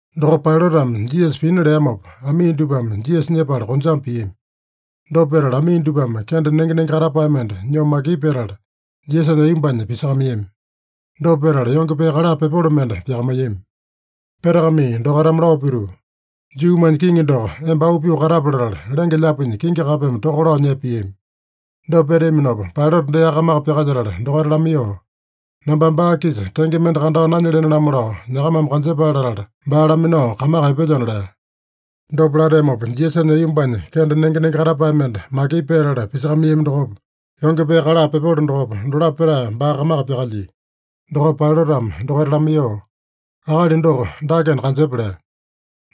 Dokopa Pailatame Jisasa pina leamopa, amii dupame Jisasa nyepala konjame piami. Dopa petala amii dupame kende nenge-nenge katapae mende nyoo makipu petala, Jisasanya aiyombanya pisakamaiyami. Dopa petala yonge pee kala pepolo mende pyakamaiyami. Petakamai dokaitame lao pituu, “Juumanya Kiŋi doko, emba auu pyoo katape” latala, lenge-lyaapinya kingi kapeme toka lao nyepa piami. Dopa peteaminopa Pailata deaka kamaka pyakalyetala dokaita lamaiyoo, “Nambame baa-kisa tenge mende kandao nanyelene-lamo lao, nyakamame kanjepale latala baa laminao kamaka epelyona” lea. Dopa lateamopa, Jisasanya aiyombanya kende nenge-nenge katapae mende makipu petala pisakamaiyami dokopa, yonge pee kala pepolo dokopa, dolapo petae baa kamaka pyakalyia. Dokopa Pailatame dokaita lamaiyoo, “Akali doko dakena kanjepa!” lea.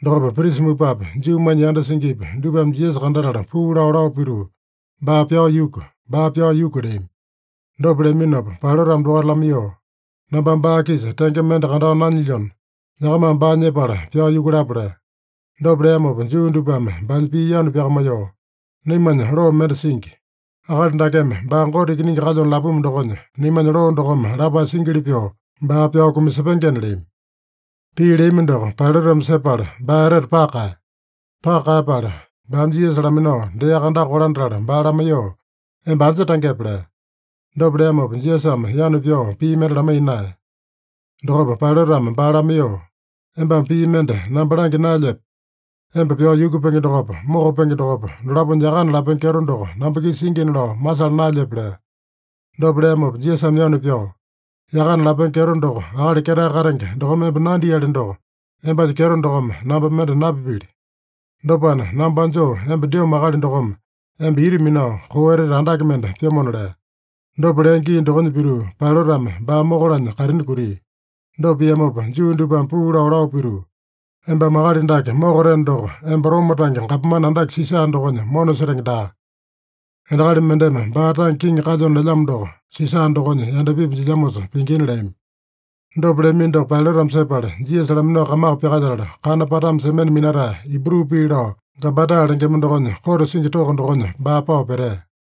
Dokopa prisa mupapi, Juumanya yanda singipi, dupame Jisasa kandatala puu lao, lao pituu, “Baa pyao yuku! Baa pyao yuku!” leami. Dopa leaminopa Pailatame dokaita lamaiyoo, “Nambame baa-kisa tenge mende kandao nanyilyona, nyakamame baa nyepala pyao yukulapa” lea. Dopa leamopa Juu dupame baanya pii yanu pyakamaiyoo, “Naimanya loo mende singi. Akali dakeme baa Gote Ikiningi kalyona lapumu dokonya, naimanya loo dokome lapae singili pyoo baa pyao kumasepengena” leami. Pii leami doko Pailatame sepala baa etete paka kaeya. Paka kaeyapala baame Jisasa laminao deaka andaka kolandatala baa lamaiyoo, “Emba anja tangepe?” lea. Dopa leamopa Jisasame yanu pyao pii mende lamaiya naeya. Dokopa Pailatame baa lamaiyoo, “Embame pii mende namba langya naelyepe? Emba pyao yukupenge dokopa, mokapenge dokopa, dolaponya yakana lapenge kyeto doko namba-kisa singina lao masala naelyepe?” lea. Dopa leamopa Jisasame yanu pyao, “Yakana lapenge kyeto doko Akali Ketae Katenge dokome emba nandiali doko, embanya kyeto dokome namba mende napipili. Dopana, namba anjoo emba dyomo akali dokome emba ita minao koo etete andake mende pyomona” lea. Dopa lea gii dokonya pituu, Pailatame baa mokalanya kaitini kutia. Dopa piamopa Juu dupame puu lao, lao pituu, “Embame akali dake mokateno doko, emba Roma tange gapomane andake Sisa dokonya mona setenge daa! Endakali mendeme baa tange kiŋi kalyona lelyamo doko Sisa dokonya yandapipi jilyamosa pingina” leami. Dopa leamino doko Pailatame sepala, Jisasa laminao kamaka pyakalyetala, Kana Patame Semene Minatae, Ibru pii lao Gabata lengema dokonya kote singi toko dokonya baa pao petea.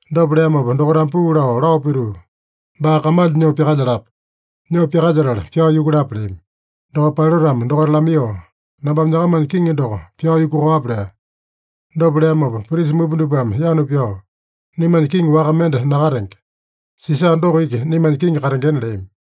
Dopa leamopa dokaitame puu lao, lao pituu, “Baa kamalya nyoo pyakalyalapa! Nyoo pyakalyetala pyao yukulapa!” leami. Dokopa Pailatame dokaita lamaiyoo, “Nambame nyakamanya kiŋi doko pyao yukuwape?” lea. Dopa leamopa prisa mupa dupame yanu pyao, “Naimanya kiŋi waka mende nakatenge. Sisa doko iki naimanya kiŋi katengena” leami.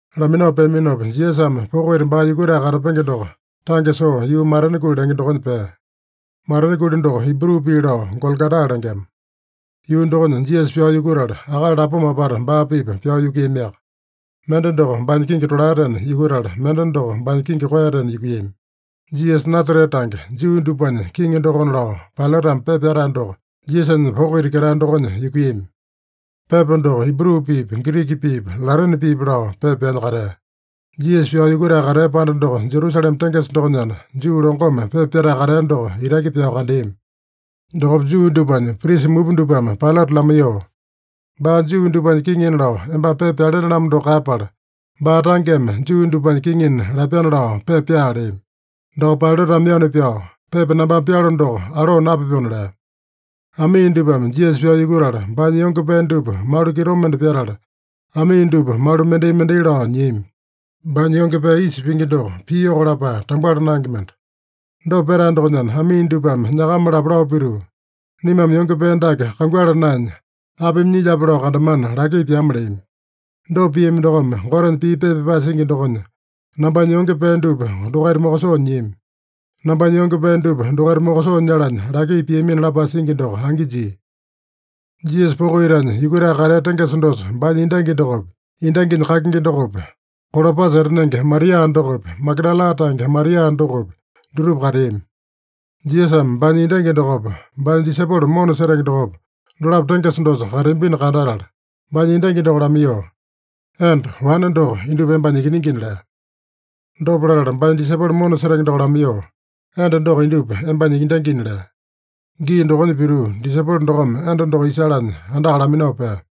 Laminao peaminopa, Jisasame poko ita baa yukutae katapenge doko tange soo yuu Matena Kuli lenge dokonya pea. (Matena Kuli doko Ibru pii lao Gologota lengema.) Yuu dokonya Jisasa pyao yukutala, akali lapoma apata baa-pipa pyao yukuiyamiaka. Mende doko baanya kingi tolaetena yukutala, mende doko baanya kingi koeyatena yukuiyami. “Jisasa Nasarete Tange, Juu Dupanya Kiŋi Dokona” lao, Pailatame pepa pyatae doko Jisasanya poko ita ketae dokonya yukuiyami. Pepa doko Ibru piipi, Giriki piipi, Latene piipi lao pepa pyanya katea. Jisasa pyao yukutae katea panda doko Jerusalema tengesa dokonyana, Juu longome pepa pyatae katea doko itaki pyao kandeami. Dokopa Juu dupanya prisa mupa dupame Pailata lamaiyoo, “Baa Juu dupanya kiŋina lao embame pepa pyalene-lamo doko kaeyapala, baa tangeme Juu dupanya kiŋina lapyana lao pepa pyaa” leami. Dokopa Pailatame yanu pyao, “Pepa nambame pyalo doko alo napyapona” lea. Amii dupame Jisasa pyao yukutala, baanya yonge pee dupa malu kitomende pyatala, amii dupa malu mendai-mendai lao nyiami. Baanya yonge pee isa pingi doko, piyoko lapae tambuala naenge mende. Dopa petae dokonyana, amii dupame nyakama-lapo lao pituu, “Naimame yonge pee dake kanguala naenya, apimi nyilyape lao kandamana laki pyama” leami. Dopa piami dokome, Gotenya pii pepa pyapae singi dokonya, “Nambanya yonge pee dupa dokaita mokosoo nyiami. Nambanya yonge pee dupa dokaita mokosoo nyalanya laki piamina” lapae singi doko angi jia. Jisasa poko itanya yukutae katea tengesa dosa baanya endangi dokopi, endanginya kakingi dokopi, Kolopasa etanenge Maria dokopi, Magadala tange Maria dokopi, dutupa kateami. Jisasame baanya endangi dokopa, baanya disaipolo mona setenge dokopa, dolapo tengesa dosa kateambino kandatala, baanya endangi lamaiyoo, “Enda, wane doko indupa embanya ikiningina” lea. Dopa latala baanya disaipolo mona setenge doko lamaiyoo, “Enda doko indupa embanya endangina” lea. Gii dokonya pituu, disaipolo dokome enda doko isalanya andaka laminao pea.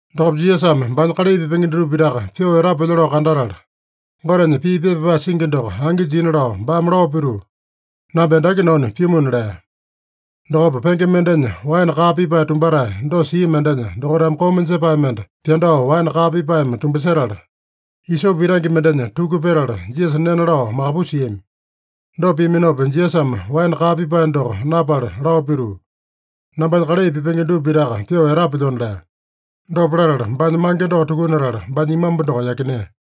Dokopa Jisasame baanya kalai pipenge dutupa pitaka pyoo etapelyo lao kandatala, Gotenya pii pepa pyapae singi doko angi jina lao, baame lao pituu: “Namba endaki nanu pyumuna” lea. Dokopa, penge mendenya waene kaa pipae tumbatae dosa sia mendenya dokaitame koma jepae mende pyandao waene kaa pipaeme tumbasetala, isope itange mendenya tuku petala, Jisasa nena lao makapusiami. Dopa piaminopa, Jisasame waene kaa pipae doko napala lao pituu, “Nambanya kalai pipenge dupa pitaka pyoo etapelyona” lea. Dopa latala baanya mange doko tukunatala, baanya imambu doko yakinea.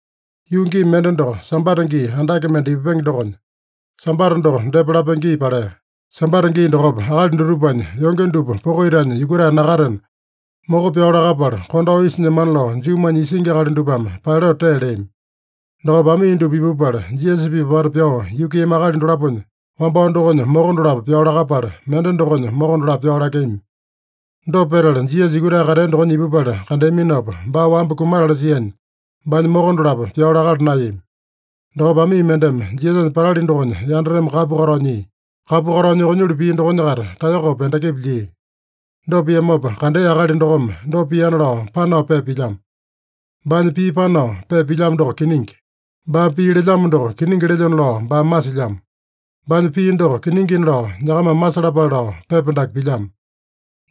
Yuu gii mende doko Sambata gii andake mende ipupenge dokonya, Sambata doko depa lapenge gii palea. Sambata gii dokopa akali dutupanya yonge dupa poko itanya yukutae nakatena, moko pyao lakapala kondao isa nyemana lao Juumanya isingi akali dupame Pailata tee leami. Dokopa amii dupa ipupala, Jisasa-pipa apata pyao yukuiyami akali dolaponya wambao dokonya moko dolapo pyao lakapala, mende dokonya moko dolapo pyao lakeami. Dopa petala, Jisasa yukutae katea dokonya ipupala kandeaminopa, baa wamba kumatala sianya, baanya moko dolapo pyao lakala naeyami. Dokopa amii mendeme Jisasanya patali dokonya yandateme kapu katao nyia. Kapu katao yukunyulu pia dokonya-kaita taeyokopa endakipa lyia. Dopa piamopa kandea akali dokome dopa piana lao panao pepa pilyamo. Baanya pii panao pepa pilyamo doko kiningi. Baame pii lelyamo doko kiningi lelyona lao baame masilyamo. Baanya pii doko kiningina lao nyakamame masalapale lao pepa dake pilyamo.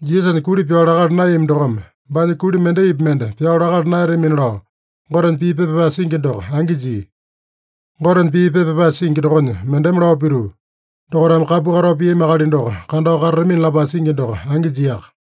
Jisasanya kuli pyao lakala naeyami dokome, “Baanya kuli mendaipi mende pyao lakala naeyatamina” lao Gotenya pii pepa pyapae singi doko angi jia. Gotenya pii pepa pyapae singi dokonya mendeme lao pituu, “Dokaitame kapu katao piami akali doko kandao katatamina” lapae singi doko angi jiaka.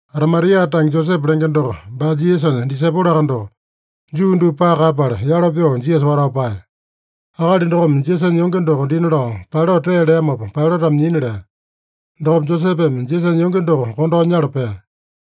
Arimatia tange Josepe lenge doko baa Jisasanya disaipoloaka doko, Juu dupa paka kaeyapala, yalo pyoo Jisasa watao paeya. Akali dokome Jisasanya yonge doko dina lao Pailata tee leamopa Pailatame nyina lea. Dokopa Josepeme Jisasanya yonge doko kondao nyala pea.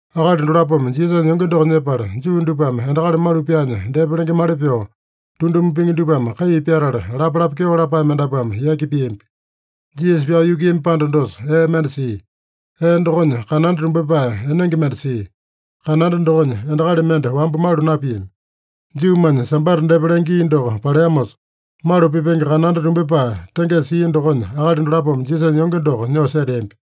Akali dolapome Jisasanya yonge doko nyepala, Juu dupame endakali malu pyaanya depa lengemali pyoo, tunduma pingi dupame kai pyatala lapalapa kyeo lapae mendapuame yaki piambi. Jisasa pyao yukuiyami panda dosa ee mende sia. Ee dokonya kananda tumbyepae enenge mende sia. Kananda dokonya endakali mende wamba malu napiami. Juumanya Sambata depa lenge gii doko paleamosa, malu pipenge kananda tumbyepae tengesa sia dokonya akali dolapome Jisasanya yonge doko nyoo seteambi.